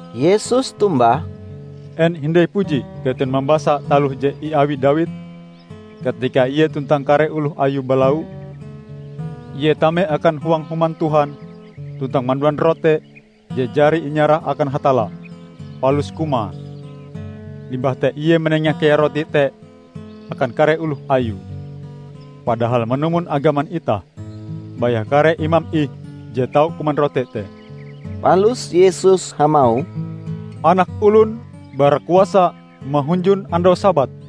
Yesus tombah, "En hindai puji keton mambasa taloh je iawi Dawid, katika ie tuntang kare oloh ayue balau? Ie tame akan huang Human Tuhan tuntang manduan rote je jari inyarah akan Hatalla, palus kumae. Limbah te ie manenga kea rote te akan kare oloh ayue. Padahal manumon agaman itah, baya kare imam ih je tau kuman rote te." Palus Yesus hamauh, "Anak Olon bara kuasa mahunjun andau Sabat!"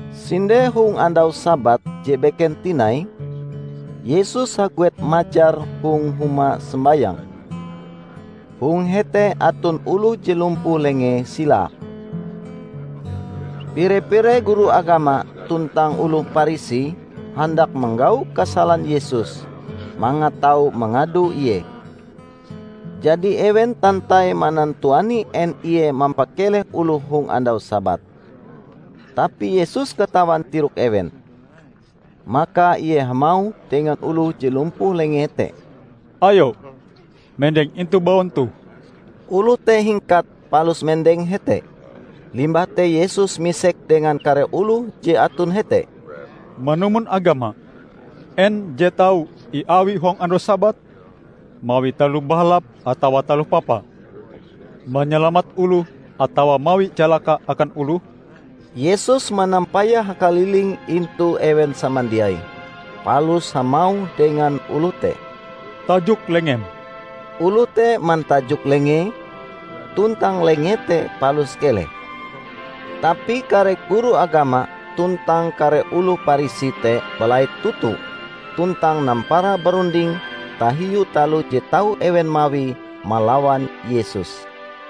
Sinde hong andau Sabat je beken tinai, Yesus haguet majar hong huma sombayang. Hong hete aton oloh je lumpuh lengee silae. Pire-pire guru agama tuntang oloh Parisi handak manggau kasalan Yesus mangat tau mangado Ie. Jadi ewen tantai manantuani en Ie mampakeleh oloh hong andau Sabat. Tapi Yesus katawan tirok ewen. Maka Ie hamauh dengan oloh je lumpuh lengee te, "Ayo, mendeng intu baun toh!" Oloh te hingkat palus mendeng hete. Limbah te Yesus misek dengan kare oloh je aton hete, "Manumon agama, en je tau iawi hong andau Sabat? Mawi taloh bahalap atawa taloh papa? Manyalamat oloh atawa mawi calaka akan oloh?" Yesus manampayah hakaliling intu ewen samandiai, palus hamauh dengan oloh te, "Tajok lengem." Oloh te mantajok lengee, tuntang lengee te palus keleh. Tapi kare guru agama tuntang kare oloh Parisi te balait toto tuntang nampara barunding tahiu taloh je tau ewen mawie malawan Yesus.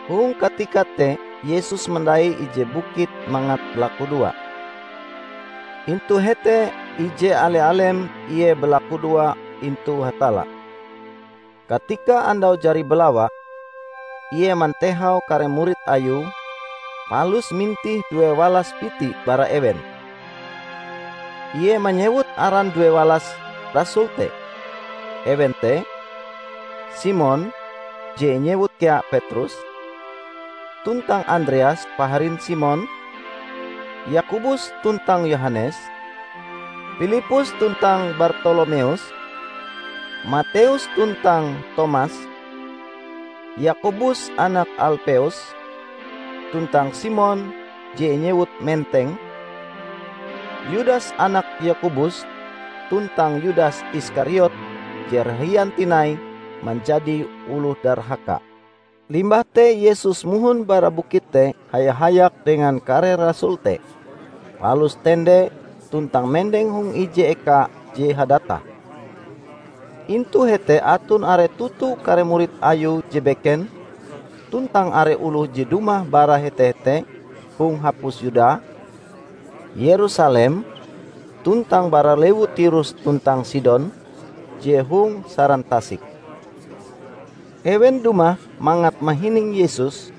Hong katika te Yesus mandai ije bukit mangat balakudoa. Intu hete ije ale-alem Ie balakudoa intu Hatalla. Katika andau jari balawa, Ie mantehau kare murid Ayue, palus mintih duewalas biti bara ewen. Ie manyewut aran duewalas rasul te. Ewen te: Simon (je inyewut kea Petrus), tuntang Andreas paharin Simon; Yakobus tuntang Yohanes, Pilippus tuntang Bartolomeus, Mateus tuntang Tomas, Yakobus anak Alpeus, tuntang Simon (je inyewut Menteng), Yudas anak Yakobus tuntang Yudas Iskariot je rahian tinai manjadi oloh darhaka. Limbah te Yesus mohon bara bukit te haya-hayak dengan kare rasul te, palus tende tuntang mendeng hong ije eka je hadatah. Intu hete aton are toto kare murid Ayue je beken tuntang are oloh je dumah bara hete-hete hong hapus Yuda, Yerusalem, tuntang bara lewu Tirus tuntang Sidon je hong saran tasik. Ewen dumah mangat mahining Yesus,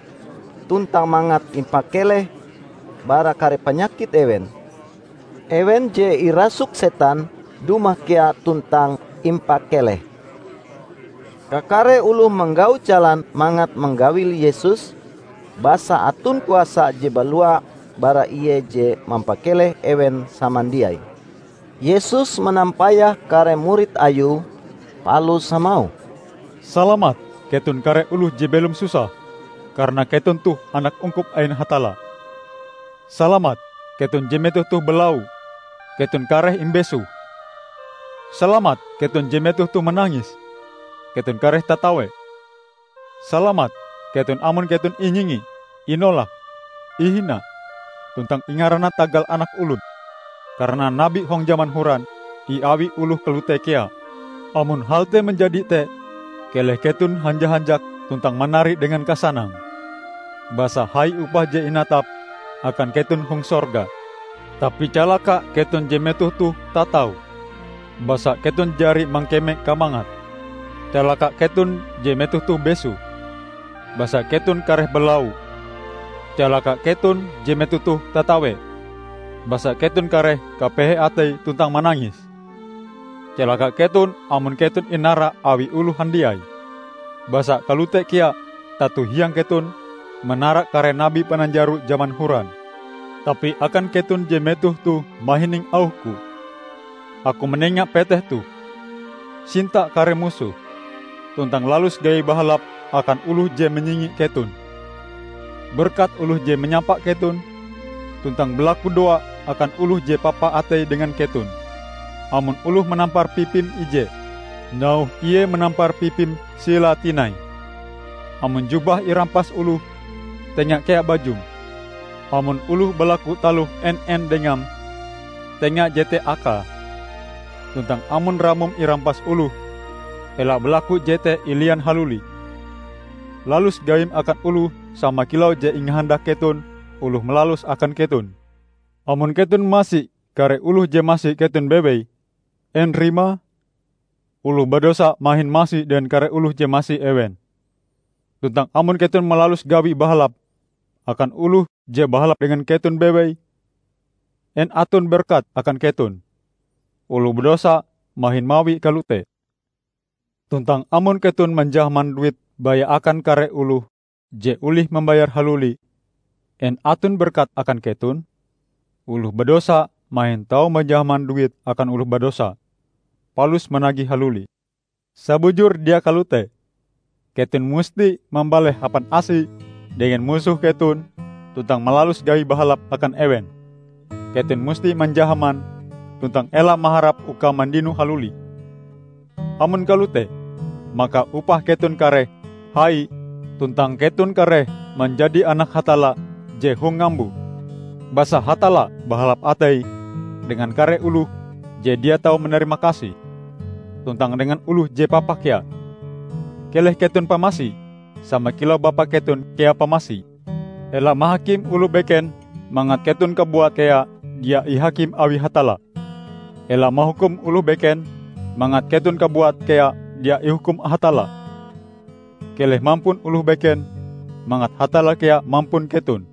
tuntang mangat impakeleh bara kare panyakit ewen. Ewen je irasuk setan dumah kea tuntang impakeleh. Kakare oloh manggau jalan mangat manggawil Yesus, basa aton kuasa je balua bara Ie je mampakeleh ewen samandiai. Yesus manampayah kare murid Ayue palus hamauh, "Salamat keton kare oloh je belom susah, karana keton toh anak ungkup ain Hatalla! Salamat keton je metoh toh balau; keton kareh imbesoh! Salamat keton je metoh toh manangis; keton kareh tatawe! Salamat keton amon keton inyingi, inolak, ihina tuntang ingarana tagal Anak Olon! Karana nabi hong jaman horan iawi oloh kalote kea. Amon hal te manjadi te keleh keton hanja-hanjak tuntang manari dengan kasanang, basa hai upah je inatap akan keton hong sorga. Tapi calaka keton je metoh toh tatau; basa keton jari mangkeme kamangat! Calaka keton je metoh toh besoh; basa keton kareh balau! Calaka keton je metoh toh tatawe; basa keton kareh kapehe atei tuntang manangis! Calaka keton, amon keton inara awi oloh handiai; basa kalote kea tato hiang keton manara kare nabi pananjaro jaman horan." "Tapi akan keton je metoh toh mahining auh-Ku, Aku manenga peteh toh: sinta kare musohm, tuntang lalus gawi bahalap akan oloh je manyingi keton. Berkat oloh je manyapa keton, tuntang balakudoa akan oloh je papa ateie dengan keton. Amon oloh manampar pipim ije, nauhe ie manampar pipim silae tinai. Amon jubahm irampas oloh, tenga kea bajum. Amon oloh balaku taloh en-en dengam, tenga jete akae; tuntang amon ramom irampas oloh, ela balaku jete ilian haluli. Lalus gawim akan oloh sama kilau je ingahandak keton oloh malaluse akan keton. Amon keton masi kare oloh je masi keton bewei, en rimae? Oloh badosa mahin masi dengan kare oloh je masi ewen! Tuntang amon keton malalus gawi bahalap akan oloh je bahalap dengan keton bewei, en aton berkate akan keton? Oloh badosa mahin mawie kalote! Tuntang amon keton manjahaman duit baya akan kare oloh je olih mambayare haluli, en aton berkate akan keton? Oloh badosa mahin tau manjahaman duit akan oloh badosa, palus managihe haluli! Sabujure dia kalote! Keton musti mambaleh hapan asi dengan musoh keton tuntang malalus gawi bahalap akan ewen. Keton musti manjahaman, tuntang ela maharap uka mandinoe haluli. Amon kalote, maka upah keton kareh hai tuntang keton kareh manjadi anak Hatalla je hong ngambo. Basa Hatalla bahalap ateie dengan kare oloh je dia tau manarimakasih, tuntang dengan oloh je papa kea. Keleh keton pamasi sama kilau Bapa keton kea pamasi!" "Ela mahakim oloh beken mangat keton kabuat kea dia ihakim awi Hatalla. Ela mahukum oloh beken, mangat keton kabuat kea dia ihukum Hatalla. Keleh mampun oloh beken, mangat Hatalla kea mampun keton.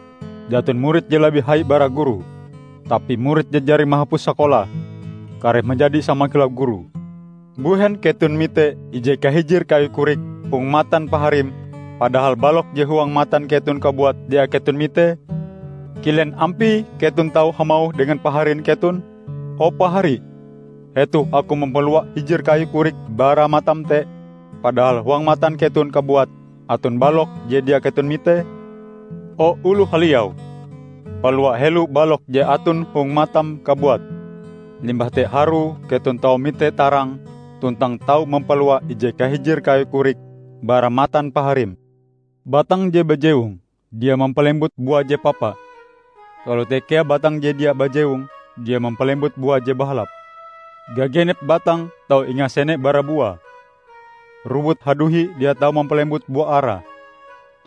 Jaton murid je labih hai bara gurue. Tapi murid je jari mahapus sakolae, kareh manjadi sama kilau gurue. Mbuhen keton mite ije kahijir kayu korik hong matan paharim, padahal balok je huang matan keton kabuat dia keton mitee? Kilen ampie keton tau hamauh dengan paharin keton, 'O pahari, hetoh aku mampalua hijir kayu korik bara matam te,' padahal huang matan keton kabuat aton balok je dia keton mitee? O oloh haliau! Palua helo balok je aton hong matam kabuat. Limbah te harue keton tau mite tarang tuntang tau mampalua ije kahijir kayu korik bara matan paharim." "Batang je bajewong dia mampalembut bua je papa. Kalote kea batang je dia bajewong dia mampalembut bua je bahalap. Gagenep batang tau ingasene bara buae. Rowut haduhi dia tau mampalembut bua ara,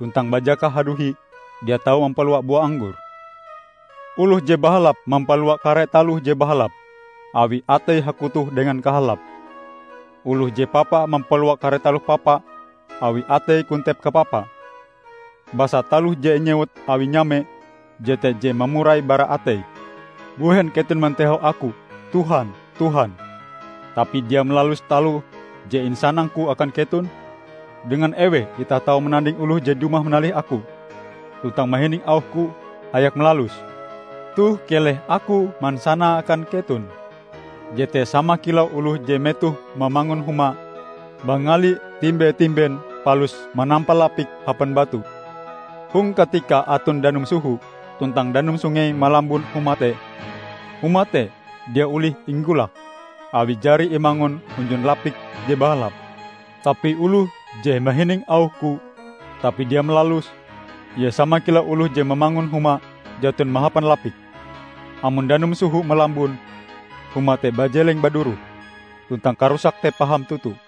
tuntang bajakah haduhi dia tau mampalua bua anggor. Oloh je bahalap mampalua kare taloh je bahalap, awi ateie hakutoh dengan kahalap. Oloh je papa mampalua kare taloh papa, awi ateie kontep kapapa. Basa taloh je inyewut awi nyame, jete je mamurai bara atei." "Mbuhen keton mantehau Aku, 'Tuhan, Tuhan,' tapi dia malalus taloh je insanang-Ku akan keton? Dengan eweh itah tau mananding oloh je dumah manalih Aku, tuntang mahining auh-Ku, hayak malaluse? -- Toh keleh Aku mansanae akan keton --. Jete sama kilau oloh je metohe mamangun huma mangalie timbe-timben, palus manampa lapike hapan batu. Hong katika aton danum soho tuntang danum sungei malambun huma te, huma te dia olih inggulak, awi jari imangun hunjun lapik je bahalap. Tapi oloh je mahining auh-Ku tapi dia malaluse, ie sama kilau oloh je mamangun huma jaton mahapan lapik. Amon danum soho malambun, huma te bajeleng baduroh; tuntang karusake te paham toto!"